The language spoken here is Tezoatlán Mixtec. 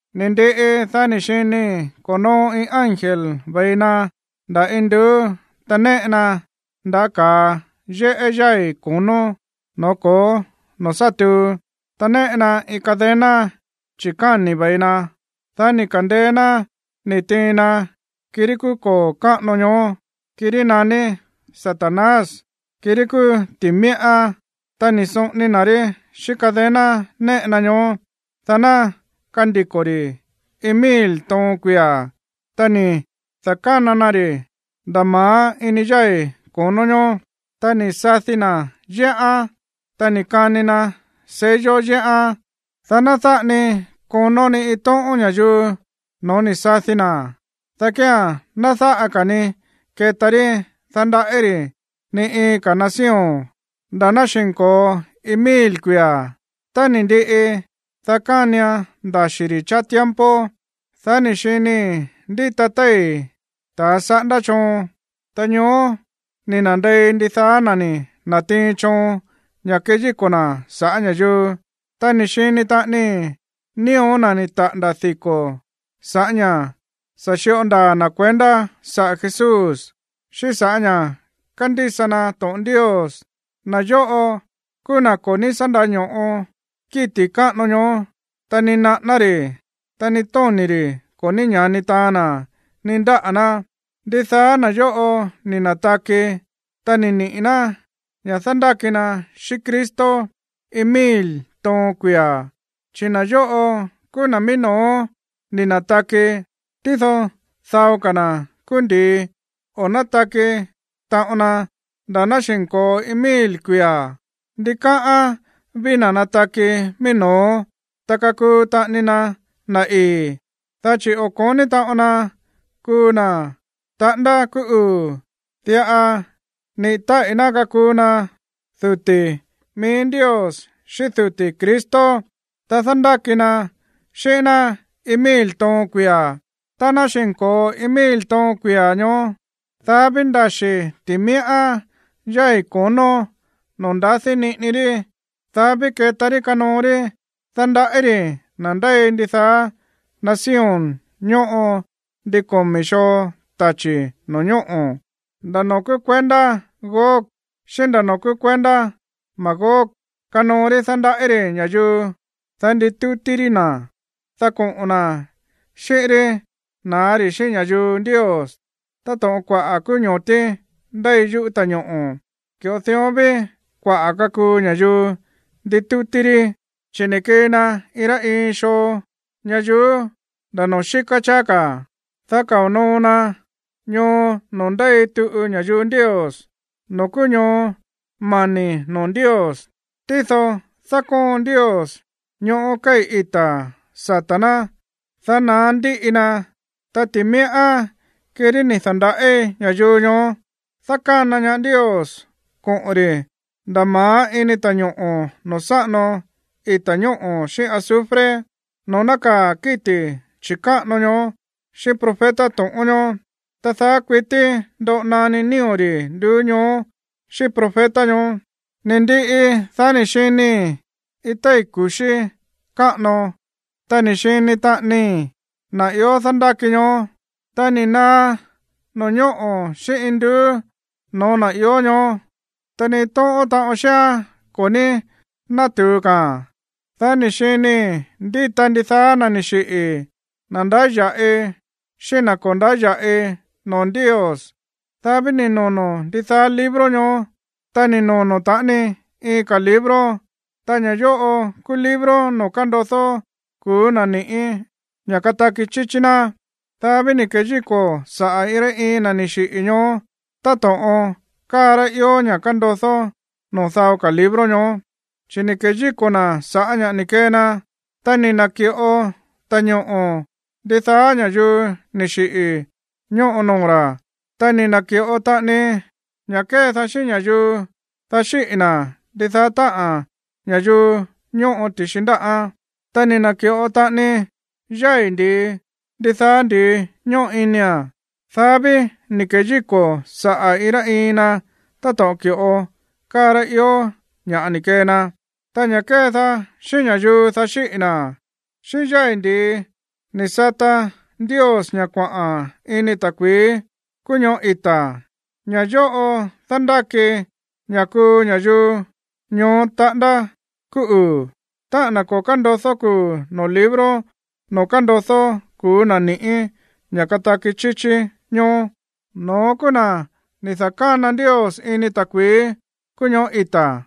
Ni̱ ndiꞌi, dá ni̱ xinii̱ ko̱noo iin ángel ve̱i na nda̱ induú, ta néꞌe na ndaꞌá ka̱a yéꞌé yái̱ ko̱nó, no̱ó ko̱ó noo̱ sá tuu, ta néꞌe na iin cadena chi̱káni̱ ve̱i na. Dá ni̱ ka̱ndeé ná ni̱ tiin na kirí kúú koo̱ káꞌano ñoó, kirí naní Satanás, kirí kúú ti̱míꞌá, ta ni̱ soꞌoni na̱ rí xíꞌín cadena néꞌe na ñoó, dá ná kandiko̱ ri̱ iin mil toon kuia̱. Ta ni̱ da̱kána na ri̱ nda̱ ma̱á ini yái̱ ko̱nó ñoó, ta ni̱ sadi na̱ yéꞌán, ta ni̱ kani na sello yéꞌán, dá ná dáꞌa ni konó ni iin tóꞌón ña̱yuu no̱ó ni̱ sadi na̱, dá kía̱n ná dáꞌa ka̱ ni keta rí dándaꞌí ri̱ ni iin ka̱ nación nda̱ ná xi̱nko̱o iin mil kuia̱. Tá ni̱ ndiꞌi, dá kánian ndaxi̱ ri̱ cháá tiempo. Dá ni̱ xinii̱ ndíta téi̱ ta̱ saꞌándá choon, ta ñoó ni̱ na̱ndei ndidaá na̱ ni̱ na̱tiin choon ña̱ keyíko̱ na̱ sa̱ꞌá ña̱yuu. Ta ni̱ xini taꞌanii nío̱ na̱ ni̱ taꞌa̱nda̱ diko̱ sa̱ꞌá ña̱ sa̱ xíꞌo ndaa̱ na̱ kuendá saꞌa̱ Jesús, xíꞌín sa̱ꞌá ña̱ kándísa na to̱ꞌon Ndios. Na̱ yóꞌo kúú na̱ ko̱ ní sá ndáño̱ꞌo kíti̱ chi̱káꞌano ñoó, ta ni naꞌáná ri̱, ta ni tóni̱ ri̱ ko̱ ní ña̱ni taan na̱ ni ndáꞌa̱ ná. Ndidaá na̱ yóꞌo ni̱ na̱taki, ta ni̱ niꞌi̱ ná ña̱ dándáki na xíꞌín Cristo iin mil toon kuia̱. Chi̱ na̱ yóꞌo kúú na̱ mií no̱ó ni̱ na̱taki. Tído dao ka̱ na̱ kúú ndi̱i, o̱ nátaki taꞌon na nda̱ ná xi̱nko̱o iin mil kuia̱. Ndikáꞌán ví na̱ nataki mií no̱ó, ta kakuu taꞌani na na̱ ii̱, dá chi̱ o̱ ko̱ní taꞌon na kuu na̱ taꞌándá kúú uu̱. Diꞌa niꞌi̱ táꞌi̱ ná kakuu na duti̱ mií Ndios xíꞌín duti̱ Cristo, ta dándáki na xíꞌín ná iin mil toon kuia̱. Tá ná xi̱nko̱o iin mil toon kuia̱ ñoó, dá ví ndaxi̱ ti̱míꞌá yái̱ ko̱nó noo̱ ndadi niꞌini rí. Dá ví keta rí kanoo rí dándaꞌí ri̱ na̱ ndéi ndidaá nación ñóꞌo ndin komi̱ xoo tachi̱ no̱ñóꞌo̱. Nda̱ noo̱ kúú kuendá Gog xíꞌín nda̱ noo̱ kúú kuendá Magog kanoo rí dándaꞌí ri̱ ña̱yuu, dá nditútí rí na̱, dá koꞌo̱n na̱ xíꞌín rí na̱á ri̱ xíꞌín ña̱yuu Ndios. Táto̱ꞌon kuaꞌa̱ kúú ño̱tí ndéi yuꞌú ta̱ñoꞌo̱, ki̱ꞌo dión ví kuaꞌa̱ kakuu ña̱yuu nditútí rí. Chi̱ ni̱ kii na iin rá iin xoo ñayuú, nda̱ noo̱ xíká cháá ka̱, dá kao̱ noo na ñoo noo̱ ndéi tuꞌu ña̱yuu Ndios, noo̱ kúú ñoo mani̱ noo̱ Ndios. Tído dákóon Ndios ñoꞌó kéi̱ ita̱ sata̱ ná, dá naá ndíꞌi na. Ta ti̱míꞌá, kirí ni̱ da̱ndaꞌí ña̱yuu ñoó, dákána ñaá Ndios koꞌo̱n ri̱ nda̱ ma̱á ini ta̱ñoꞌo̱ noo̱ sáꞌano ita̱ ñóꞌo̱ xíꞌín azufre, noo̱ nákaa̱ kíti̱ chi̱káꞌano ñoó xíꞌín profeta to̱ꞌón ñoó. Ta daá kuití ndoꞌo naní nío̱ ri̱ nduú ñoó xíꞌín profeta ñoó. Ni̱ ndiꞌi, dá ni̱ xinii̱ iin téi̱ ku̱xí káꞌano, ta ni̱ xini taꞌanii na̱ ió dándáki ñoó. Ta ni̱ naá no̱ñóꞌo̱ xíꞌín induú no̱ó na̱ ió ñoó, ta ni iin tóꞌón taꞌon xíán ko̱ ní nátu̱u ka̱a̱n. Dá ni̱ xinii̱ ndíta ndidaá na̱ ni̱ xiꞌi̱, na̱ ndáya̱ꞌi xíꞌín na̱ ko̱ ndáya̱ꞌi noo̱ Ndios. Dá ví ni̱ nono̱ ndidaá libro ñoó. Ta ni̱ nono̱ taꞌani iin ka̱ libro, ta ña̱ yóꞌo kúú libro noo̱ kándodó kuu̱ na̱ ni̱ꞌí ña̱ kataki chíchí ná. Dá ví ni̱ keyíko̱ saꞌa̱ iin rá iin na̱ ni̱ xiꞌi̱ ñoó táto̱ꞌon káa rá ió ña̱ kándodó noo̱ dao ka̱ libro ñoó, chi̱ ni̱ keyíko̱ na̱ sa̱ꞌá ña̱ ni̱ kee na. Ta ni̱ na̱ki̱ꞌo ta̱ñoꞌo̱ ndidaá ña̱yuu ni̱ xiꞌi̱ ñóꞌo noo̱ ra̱. Ta ni̱ na̱ki̱ꞌo taꞌani ña̱ kédaá xíꞌín ña̱yuu, dá xíꞌi̱ na̱, ndidaá táꞌa̱n ña̱yuu ñóꞌo ti̱xi ndáꞌán. Ta ni̱ na̱ki̱ꞌo taꞌani yái̱ ndi̱i ndidaá ndi̱i ñóꞌo inia̱n. Dá ví ni̱ keyíko̱ saꞌa̱ iin rá iin na táto̱ꞌon ki̱ꞌo káa rá ió ña̱ꞌa ni̱ kee na. Ta ña̱ kédaá xíꞌín ña̱yuu, dá xíꞌi̱ na̱, xíꞌín yái̱ ndi̱i ni̱ sata Ndios ña̱ kuaꞌa̱n ini ta̱kui̱í kúú ñoꞌó ita̱. Ña̱ yóꞌo dándáki ña̱ kuu ña̱yuu ñoó taꞌándá kúú uu̱. Táꞌa̱n na̱ ko̱ kándodó kuu̱ noo̱ libro noo̱ kándodó kuu̱ na̱ ni̱ꞌí ña̱ kataki chíchí ñoó, no̱ón kúú na̱ ni̱ da̱kána Ndios ini ta̱kui̱í kúú ñoꞌó ita̱.